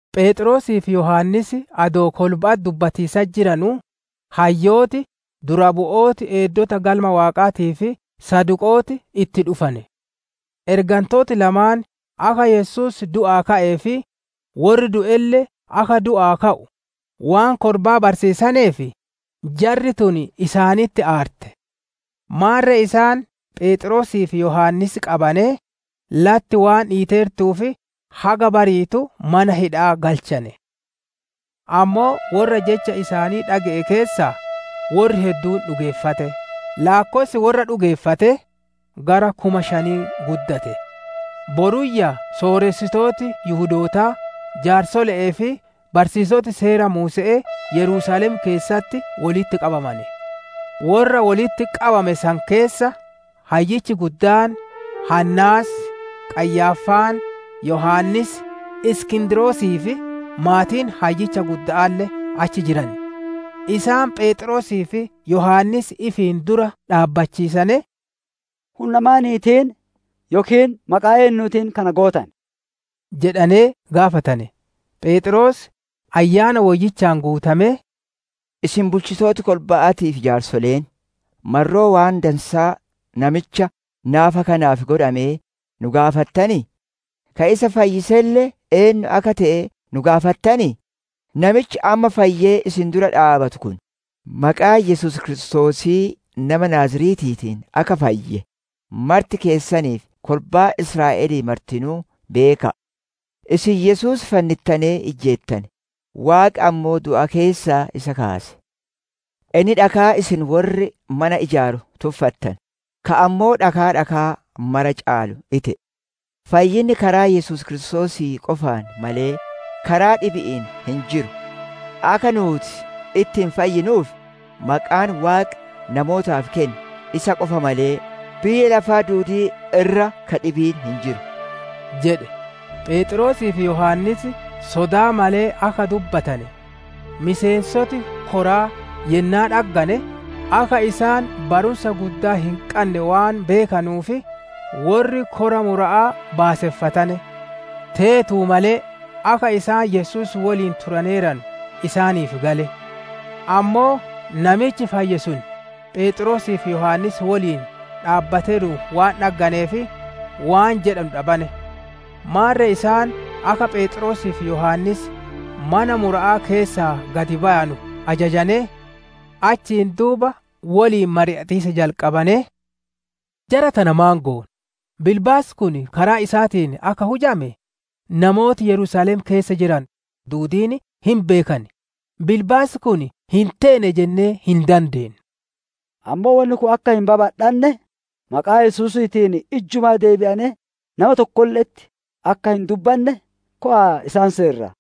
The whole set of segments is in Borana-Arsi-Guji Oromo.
Pheexroosii fi Yohaannis adoo kolba'atti dubbatiisatti jiranuu hayyooti, dura buutoti eeddota Galma Waaqaatii fi Saduqooti itti dhufane. Ergantooti lamaan akka Yesuus du'aa ka'ee fi worri du'elle akka du'aa ka'u waan kolbaa barsiisaneef, jarri tun isaanitti aarte. Maarre isaan Pheexroosii fi Yohaannis qabanee, latti waan dhiiteertuuf haga bariitu mana hidha'aa galchane. Ammoo worra jecha isaanii dhage'e keessaa worri hedduun dhugeeffate; laakkossi worra dhugeeffatee gara kuma shanii guddate. Boruyyaa sooressitooti Yihudootaa, jaarsole'ee fi barsiisoti Seera Muuse'ee Yerusaalem keessatti wolitti qabamane. Worra wolitti qabame san keessa hayyichi guddaan Haannaas, Qayyaaffaan, Yohaannis, Iskindrosii fi maatiin Hayyicha gudda'aalle achi jiran. Isaan Pheexroosii fi Yohaannis ifiin dura dhaabbachiisanee, «Hunna maaniitiin yookiin maqaa eennuutiin Kana gootane?» jedhanee gaafatane. Pheexroos Ayyaana Woyyichaan guutamee, «Isin bulchitooti kolba'aatii fi jaarsoleen, marroo waan dansaa namicha naafa kanaaf godhamee nu gaafattanii? Ka isa fayyiselle eennu akka te'e nu gaafattanii? Namichi amma fayyee isin dura dhaabbatu kun, maqaa Yesuus Kiristoosii nama Naaziretiitiin akka fayye, marti keessanii fi kolbaan Israa'elii martinuu beeka'a! Isin Yesuus fannittanee ijjeettane; Waaqi ammoo du'a keessaa isa kaase. Inni dhakaa isin worri mana ijaaru tuffattane, ka ammoo dhakaa dhakaa mara caalu ite'e. Fayyinni karaa Yesuus Kiristoosii qofaan malee, karaa dhibi'iin hin jiru; akka nuuti ittiin fayyinuuf, maqaan Waaqi namootaaf kenne, isa qofa malee, biyya lafaa duudii irra ka dhibiin hin jiru» jedhe. Pheexroosii fi Yohaannis sodaa malee akka dubbatane miseensoti koraa yennaa dhaggane, akka isaan barumsa guddaa hin qanne waan beekanuuf, worri kora mura'aa baaseffatane. Teetu malee akka isaan Yesuus woliin turaneeranu isaaniif gale. Ammoo namichi fayye sun, Pheexroosii fi Yohaannis woliin dhaabbateeruun waan dhagganeef waan jedhanu dhabane. Maarre isaan akka Pheexroosii fi Yohaannis mana mura'aa keessaa gad bayanu ajajanee, achiin duuba woliin mari'atiisa jalqabanee, «Jara tana maan goona? Bilbaasi kun karaa isaaniitiin akka hujame namooti Yerusaalem keessa jiranu duudiin hin beekan, bilbaasi kun hin teene jennee hin dandeennu. Ammoo wonni kun akka hin babadhanne, maqaa Yesuusiitiin ijjumaa deebi'anee nama tokkolle'etti akka hin dubbanne, kowa'a isaan seerraa»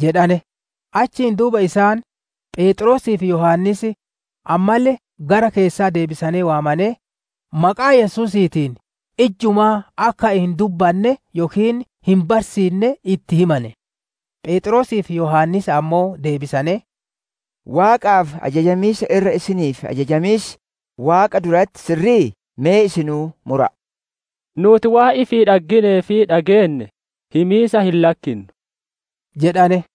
jedhane. Achiin duuba isaan Pheexroosii fi Yohaannis ammalle gara keessaa deebisanee waamanee maqaa Yesuusiitiin ijjumaa akka hin dubbanne yookiin hin barsiinne itti himane. Pheexroosii fi Yohaannis ammoo deebisanee, «Waaqaaf ajajamiisa irra isiniif ajajamiis Waaqa duratti sirri'ii? Me isinuu mura'a. Nuuti waan ifii dhagginee fi dhageenne himiisa hin lakkinnu» jedhane.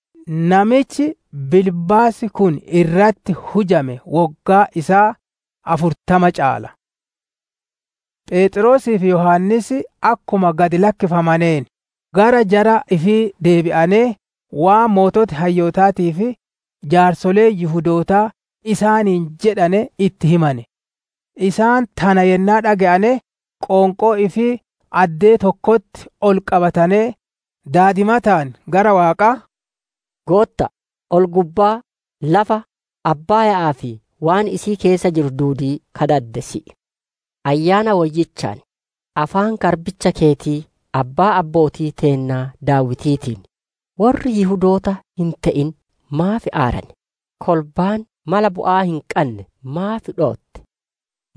Namichi bilbaasi kun irratti hujame woggaan isaa afurtama caala. Pheexroosii fi Yohaannis akkuma gad lakkifamaneen, gara jara ifii deebi'anee waan sooreyyiin hayyootaatii fi jaarsoleen Yihudootaa isaaniin jedhane itti himane. Isaan tana yennaa dhage'ane, qoonqoo ifii addee tokkotti ol qabatanee daadimataan gara Waaqaa, «Gootta'a, ol-gubbaa, lafa, Abbaaya'aa fi waan isii keessa jiru duudii ka dade si'i. Ayyaana Woyyichaan, afaan garbicha keeti Abbaa abbootii teennaa Daawitiitiin, «‹Worri Yihudoota hin te'in maaf aarane? Kolbaan mala bu'aa hin qanne maaf dhootte?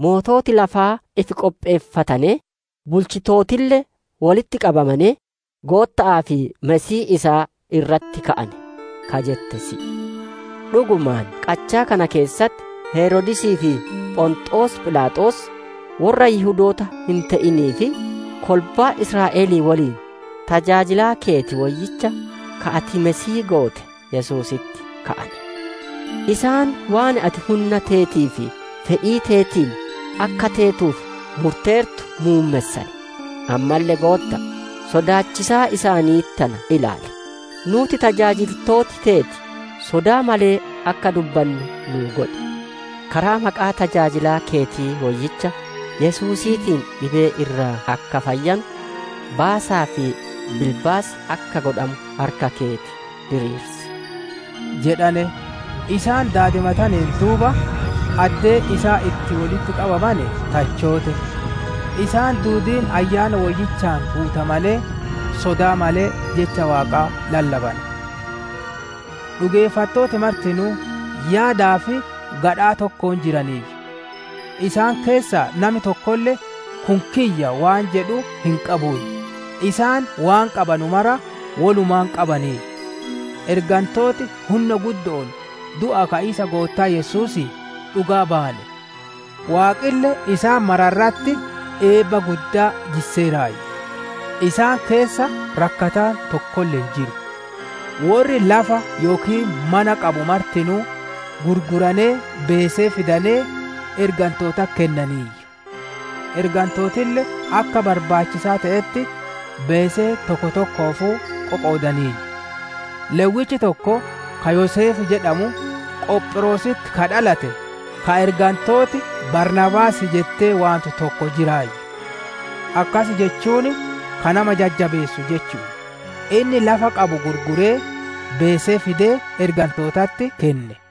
Moototi lafaa ifi qopheeffatanee, bulchitootille wolitti qabamanee, Gootta'aa fi Masiihii isaa irratti ka'ane› ka jette si'i. «Dhugumaan qachaa kana keessatti Heroodisii fi Phonxoos Philaaxoos, worra Yihudoota hin te'inii fi kolbaa Israa'elii woliin, tajaajilaa keeti Woyyicha, ka ati Masiihii goote Yesuusitti ka'ane. Isaan waan ati hunna teetii fi fedhii teetiin akka teetuuf murteertu muummessane. Ammalle Gootta'a, sodaachisaa isaanii tana ilaali, nuuti tajaajiltooti teeti sodaa malee akka dubbannu nu godhi. Karaa maqaa tajaajilaa keeti woyyicha Yesuusiitiin dhibee irraa akka fayyanu, baasaa fi bilbaasi akka godhamu harka keeti diriirsi» jedhane. Isaan daadimataneen duuba, addeen isaan itti wolitti qabamane tachoote. Isaan duudiin Ayyaana Woyyichaan guutamanee sodaa malee jecha Waaqaa lallabane. Dhugeeffattooti martinuu yaadaa fi gadhaa tokkoon jiraniiyyu. Isaan keessaa nami tokkolle, «Kun kiyya» waan jedhu hin qabuuyyu; isaan waan qabanu mara wolumaan qabaniiyyu. Ergantooti hunna guddo'oon du'aa ka'iisa Goottaa Yesuusii dhugaa bayane. Waaqille isaan mara irratti eebba guddaa jisseeraayyu. Isaan keessa rakkataan tokkolle hin jiru. Worri lafa yookiin mana qabanu martinuu gurguranee beesee fidanee, ergantootatti kennaniiyyu; ergantootille akka barbaachisaa te'etti beesee tokko tokkoofuu qoqoodaniiyyu. Lewwichi tokko, ka Yoseef jedhamu, Qophiroositti ka dhalate, ka ergantooti «Baarnaabaas» jettee waantu tokko jiraayyu; akkas jechuun «Ka nama jajjabeessu» jechu'u; inni lafa qabu gurguree, beesee fidee ergantootatti kenne.